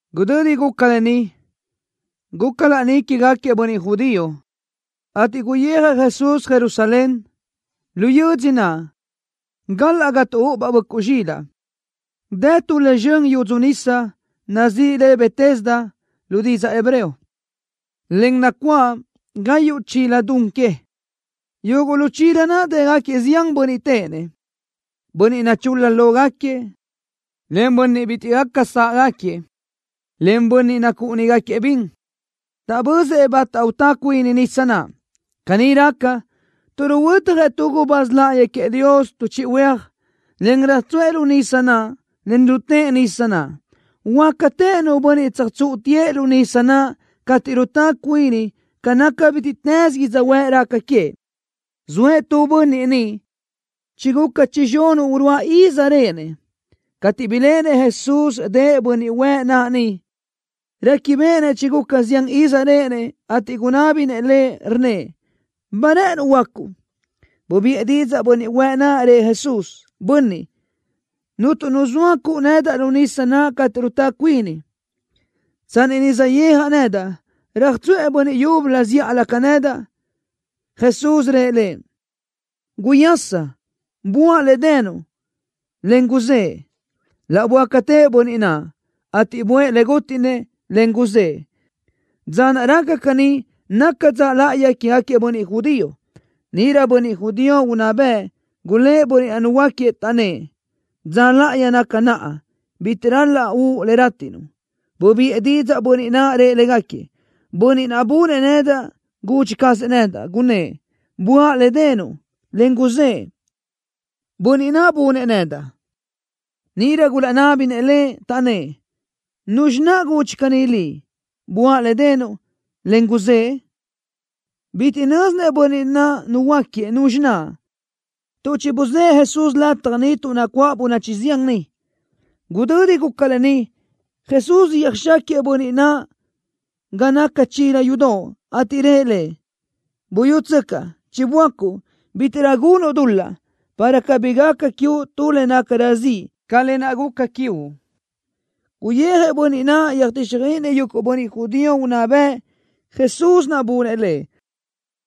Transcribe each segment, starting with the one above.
Gudödi guca lë ni, guca laní quégaquiëʼ bönniʼ judío, ateʼ guyijëʼ Jesús Jerusalén. Lu yödzö naʼ, galaʼ ga tuʼúʼubaʼ böʼcuʼ zxilaʼ, dë tu le zxön yudzu nisa, nazíʼi le Betesda lu didzaʼ hebreo, en nacuáʼ gayuʼ chila don que. Yuguʼ lu chila naʼ dë́gaquiëʼ zián bönniʼ téʼenëʼ, bönniʼ nachul-la lógaquiëʼ, en bönniʼ bitiʼ gaca sáʼgaquiëʼ, en bönniʼ nacúʼunigaquiëʼ bin. Taʼbözëʼ bata utá cuini nisa naʼ. Caní raca, tuʼ ruhuötjëʼ tu gubáz láʼayi queëʼ Dios tu chiʼi huéaj, en röjtsuʼë lu nisa naʼ, en rutë́ʼ nisa naʼ. Huöácatëʼ nu bönniʼ tsöjtsúʼutiëʼ lu nisa naʼ cateʼ rutá cuini ca naca bítiʼtës yödzöhuë́ʼ raca queëʼ. Zoëʼ tu bönniʼ niʼ, chiguca chizxunuʼ uruáʼ iz réʼenëʼ. Cateʼ biléʼenëʼ Jesús dëʼ bönniʼ huëʼ naʼ niʼ, réquibeʼenëʼ chiguca zián iz réʼenëʼ, ateʼ gunábinëʼ lëʼ, rnnëʼ: —¿Ba rë́ʼënuʼ huöácuʼ? Bubiʼë didzaʼ bönniʼ huëʼ naʼ, rëʼ Jesús: —Bönniʼ, cuntu nu zoa cuʼu nedaʼ lu nisa naʼ cateʼ rutá cuini. Tsanni saʼyéajaʼ nedaʼ, röjtsuʼë bönniʼ yúbölö zíʼalö ca nedaʼ. Jesús rëʼ lëʼ: —Guyaschi. Buáʼ le denuʼ, en guzëʼe. Laʼ böácatëʼ bönniʼ naʼ, ateʼ buʼë le gútiʼnëʼ, en guzë́ʼë. Dza naʼ raca caní naca dza láʼayi quégaquiëʼ bönniʼ judío. Níʼirö bönniʼ judío unná bëʼ gulë́ʼ bönniʼ naʼ nuhuöáquiëʼ, taʼnnë́ʼ: —Dza láʼayi naca naʼa. Bitiʼ ral-laʼ uʼu le rátiʼnuʼ. Bubiʼë didzaʼ bönniʼ naʼ, rëʼ légaquiëʼ: —Bönniʼ naʼ bunëʼ nedaʼ gudxi cazëʼ nedaʼ, gunnë́ʼ: “Buáʼ le denuʼ, en guzëʼe.” Bönniʼ naʼ bunëʼ nedaʼ. Níʼirö gulaʼnábinëʼ lëʼ, taʼnnë́ʼ: —¿Nuzxi naʼ gudxi caní liʼ: “Buáʼ le denuʼ, en guzëʼe”? Bitiʼ nö́zinëʼ bönniʼ naʼ nuhuöáquiëʼ nuzxi naʼ, tuʼ chibuzë́ʼë Jesús lataj niʼ tuʼ nacuáʼ bönachi zián niʼ. Gudödi guca lë ni, Jesús yöjxáquiëʼ bönniʼ naʼ ga naca chila yudoʼ, ateʼ rëʼ lëʼ: —Buyútsöcaʼ. Chiböácuʼ. Bítiʼrö gunuʼ dul-laʼ, para cabí gaca quiuʼ tu le nácarö ziʼ ca lë naʼ guca quiuʼ. Guyijëʼ bönniʼ naʼ, yöjtíxjöiʼinëʼ yuguʼ bönniʼ judío unná bëʼ Jesús naʼ bunëʼ lëʼ.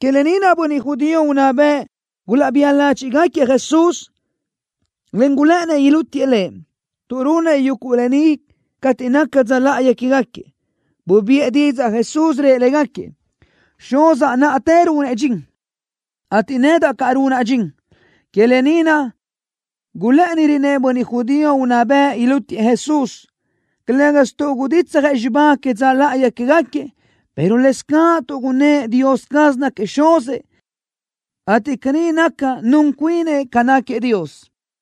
Que lë ni naʼ bönniʼ judío unná bëʼ gulaʼbía ládxiʼgaquiëʼ Jesús, en gulë́ʼënnëʼ ilútiëʼ Lëʼ, tuʼ runëʼ yuguʼ lë ni cateʼ naca dza láʼayi quégaquiëʼ. Bubiʼë didzaʼ Jesús, rëʼ légaquiëʼ: —Xuzaʼ náʼatë runëʼ dxin, ateʼ nedaʼ caʼ runaʼ dxin. Que lë ni naʼ gulë́ʼënirönëʼ bönniʼ judío unná bëʼ ilútiëʼ Jesús, calë́gasö tuʼ guditsjëʼ xibá que dza láʼayi quégaquiëʼ, pero lëscaʼ tuʼ gunnë́ʼ Dios caz náquiëʼ Xuzëʼ, ateʼ caní naca nun cuinëʼ ca náquiëʼ Dios.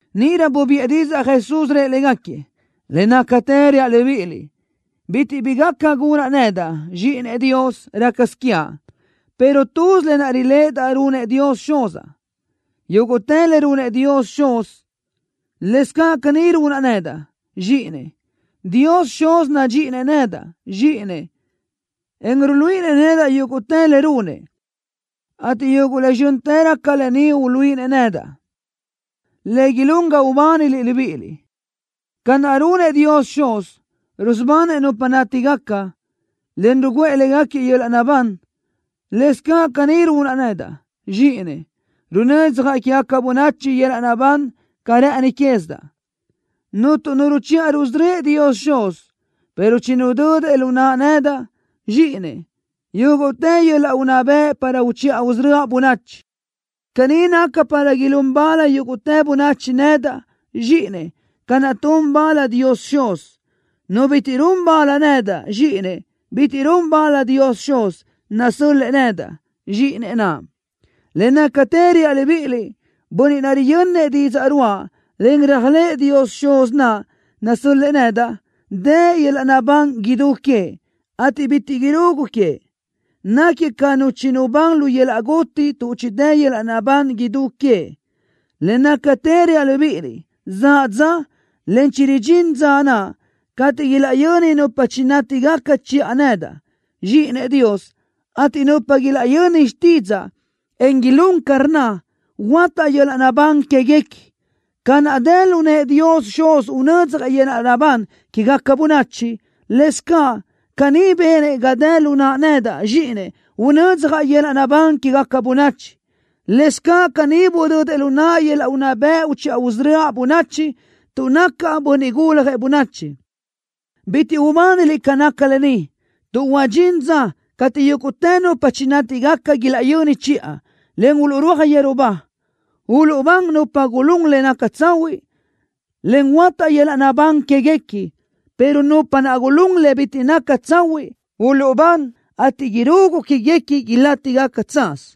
Níʼirö bubiʼë didzaʼ Jesús, rëʼ légaquiëʼ: —Le nácatë reaʼ libíʼiliʼ. Bitiʼ bi gaca gunaʼ nedaʼ, Zxíʼinëʼ Dios, rácasö quiaʼ, pero tuz lë naʼ riléʼedaʼ runëʼ Dios Xuz. Yúguʼtë le runëʼ Dios Xuz, lëscaʼ caní runaʼ nedaʼ, Zxíʼinëʼ. Dios Xuz nadxíʼinëʼ nedaʼ, Zxíʼinëʼ, en ruluíʼinëʼ nedaʼ yúguʼtë le runëʼ, ateʼ yuguʼ le zxö́ntërö ca lë ni uluíʼinëʼ nedaʼ, le ilún ga ubániliʼ libíʼiliʼ. Ca naʼ runëʼ Dios Xuz, rusubanëʼ nupa nátigaca, en rugúʼë légaquiëʼ yöl-laʼ naʼbán, lëscaʼ caní runaʼ nedaʼ, Zxíʼinëʼ, runödzjaʼ quégaca bönachi yöl-laʼ naʼbán ca rë́ʼëni quézidaʼ. Cuntu nu ruchiʼa rusörö́ëʼ Dios Xuz, pero chinudödëʼ lu naʼa nedaʼ, Zxíʼinëʼ, yúguʼtë yöl-laʼ unná bëʼ para uchiʼa usörö́aʼ bönachi. Caní naca para ilún bal yúguʼtë bönachi nedaʼ, Zxíʼinëʼ, ca naʼ tun bal Dios Xuz. Nu bitiʼ run bal nedaʼ, Zxíʼinëʼ, bitiʼ run bal Dios Xuz, nasö́l-lëʼë nedaʼ, Zxíʼinëʼ naʼ. ’Le nácatë reaʼ libíʼiliʼ. Bönniʼ naʼ riyönnëʼ didzaʼ ruáʼa, en réajlëʼë Dios Xuz naʼ nasö́l-lëʼë nedaʼ dë yöl-laʼ naʼbán idú queëʼ, ateʼ bitiʼ irugu queëʼ. Náquiëʼ ca nu chinubán lu yöl-laʼ guti tuʼ chidë́ yöl-laʼ naʼbán idú queëʼ. Le nácatë reaʼ libíʼiliʼ, zaʼ dza, en chiridxín dza naʼ, cateʼ ilaʼyöni nupa chinátigaca chiʼa nedaʼ, Zxíʼinëʼ Dios, ateʼ nupa ilaʼyöni xtídzaʼa, en ilún ca rnna, huöátaʼ yöl-laʼ naʼbán quéguequi. Ca naʼ dë lu nëʼë Dios Xuz unödzjëʼ yöl-laʼ naʼbán quégaca bönachi, lëscaʼ caní benëʼ ga dë lu naʼa nedaʼ, Zxíʼinëʼ, unödzjaʼ yöl-laʼ naʼbán quégaca bönachi. Lëscaʼ caní budödëʼ lu naʼa yöl-laʼ unná bëʼ uchiʼa usörö́aʼ bönachi, tuʼ nacaʼ Bönniʼ Guljëʼ Bönachi. Bitiʼ ubániliʼ ca naca lë ni, tuʼ huadxín dza cateʼ yúguʼtë nupa chinátigaca ilaʼyöni chiʼa, en uluʼrúaj yeru ba. Uluʼbán nupa naʼ gulún le naca tsahuiʼ, en huöátaʼ yöl-laʼ naʼbán quéguequi, pero nupa naʼ gulún le bitiʼ naca tsahuiʼ, uluʼbán, ateʼ irugu quéguequi ilátigaca tsaz.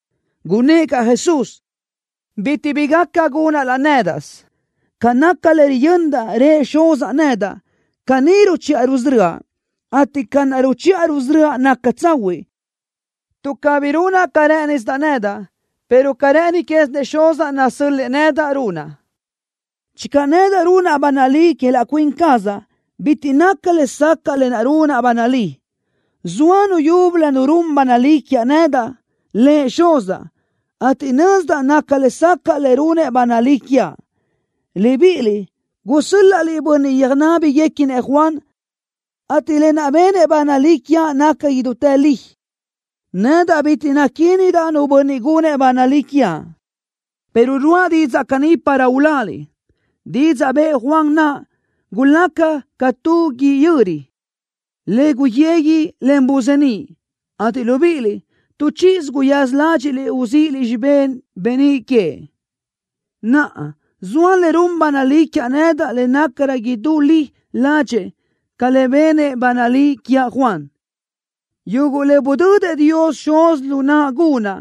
Gunnë́ʼ caʼ Jesús: —Bitiʼ bi gaca gunaʼ laʼ nédaʼsö. Ca naca le riyöndaʼ rëʼ Xuzaʼ nedaʼ, caní ruchiʼa rusörö́aʼ, ateʼ ca naʼ ruchiʼa rusörö́aʼ naca tsahuiʼ, tuʼ cabí runaʼ ca rë́ʼënisidaʼ nedaʼ, pero ca rë́ʼëni quézinëʼ Xuzaʼ nasö́l-lëʼë nedaʼ, runaʼ. Channö nedaʼ runaʼ ba nalí que laʼ cuin cazaʼ, bitiʼ naca lesacaʼ lë naʼ runaʼ ba nalí. Zoa Nu yúbölö Nu run ba nalí quiaʼ nedaʼ, Lëʼ Xuzaʼ, ateʼ nözdaʼ naca lesacaʼ le runëʼ ba nalí quiaʼ. Libíʼiliʼ gusö́l-laʼliʼ bönniʼ yöjnábiguequinëʼ Juan, ateʼ lë naʼ benëʼ ba nalí quiaʼ naca idútë li. Nedaʼ bitiʼ naquindaʼ nu bönniʼ gunëʼ ba nalí quiaʼ, pero ruáʼa didzaʼ caní para uláliʼ. Didzaʼ bëʼë Juan naʼ gulaca ca tu guíʼ yöri, le guyegui, en buzeníʼ, ateʼ libíʼiliʼ, tu chíʼisö guyaza ládxiʼliʼ uzíʼiliʼ xibé beníʼ queëʼ. Naʼa, zoa le run ba nalí quiaʼ nedaʼ le nácarö idú li ladxeʼ ca lë naʼ benëʼ ba nalí quiaʼ Juan. Yuguʼ le budödëʼ Dios Xuz lu naʼa gunaʼ,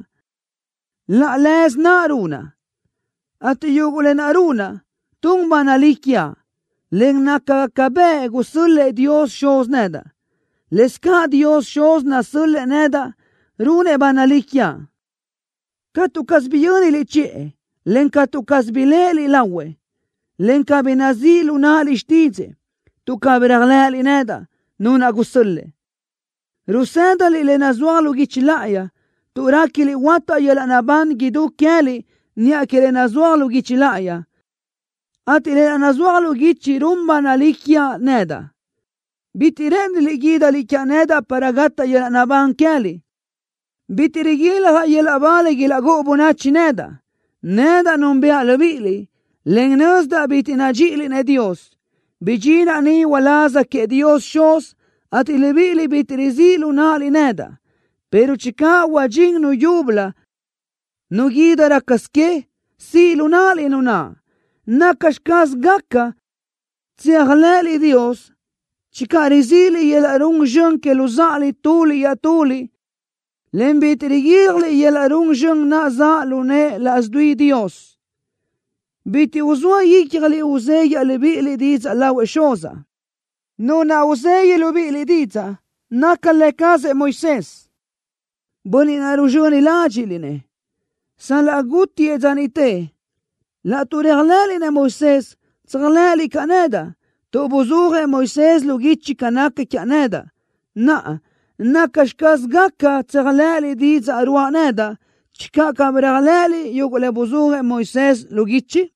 laʼ leze naʼ runaʼ, ateʼ yuguʼ lë naʼ runaʼ, tun ba nalí quiaʼ, en nácagaca bëʼ gusö́l-lëʼë Dios Xuz nedaʼ. Lëscaʼ Dios Xuz nasö́l-lëʼë nedaʼ runëʼ ba nalí quiaʼ. Catu caz biyö́niliʼ chiʼë, en catu caz biléʼeliʼ lahuëʼ, en cabí nazíʼ lu náʼaliʼ xtídzëʼë, tuʼ cabí réajlëʼëliʼ nedaʼ, Nu naʼ gusö́l-lëʼë. Rusë́daliʼ le nazúaj lu guichi láʼayi, tuʼ réquiliʼ huátaʼ yöl-laʼ naʼbán idú queë́liʼ niʼa que lë naʼ nazúaj lu guichi láʼayi, ateʼ lë naʼ nazúaj lu guichi run ba nalí quiaʼ nedaʼ. Bitiʼ rë́ʼëniliʼ guídaliʼ quiaʼ nedaʼ para gataʼ yöl-laʼ naʼbán queë́liʼ. ’Bitiʼ riguiljaʼ yöl-laʼ ba le ilaʼgúʼu bönachi nedaʼ. Nedaʼ núnbëʼa libíʼiliʼ, en nözdaʼ bitiʼ nadxíʼiliʼ-nëʼ Dios. Bidxinaʼ ni uláz queëʼ Dios Xuz, ateʼ libíʼiliʼ bitiʼ rizíʼ lu náʼaliʼ nedaʼ, pero channö huadxín nu yúbölö nu guídi rácasö que, siʼ lu náʼaliʼ nu naʼ. ¿Nacxi caz gaca tséajlëʼëliʼ Dios channö rizíʼiliʼ yöl-laʼ run zxön que luzáʼaliʼ tuliʼ iaʼtuliʼ, en bitiʼ riguíljaliʼ yöl-laʼ run zxön naʼ zaʼ lu nëʼë laʼs dui Dios? Bitiʼ uzóa ícjaliʼ uzéguiaʼ libíʼiliʼ didzaʼ lahuëʼ Xuzaʼ. Nu naʼ uzegui libíʼiliʼ didzaʼ naca lë cazëʼ Moisés, bönniʼ naʼ ruzxöni ládxiʼliʼ-nëʼ, sal-laʼ gútiëʼ dza niʼte. Laʼtuʼ réajlëʼëliʼ-nëʼ Moisés, tséajlëʼëliʼ caʼ nedaʼ, tuʼ buzúajëʼ Moisés lu guichi ca naca quiaʼ nedaʼ. Naʼa, ¿nacxi caz gaca tséajlëʼëliʼ didzaʼ ruáʼa nedaʼ channö cabí réajlëʼëliʼ yuguʼ le buzúajëʼ Moisés lu guichi?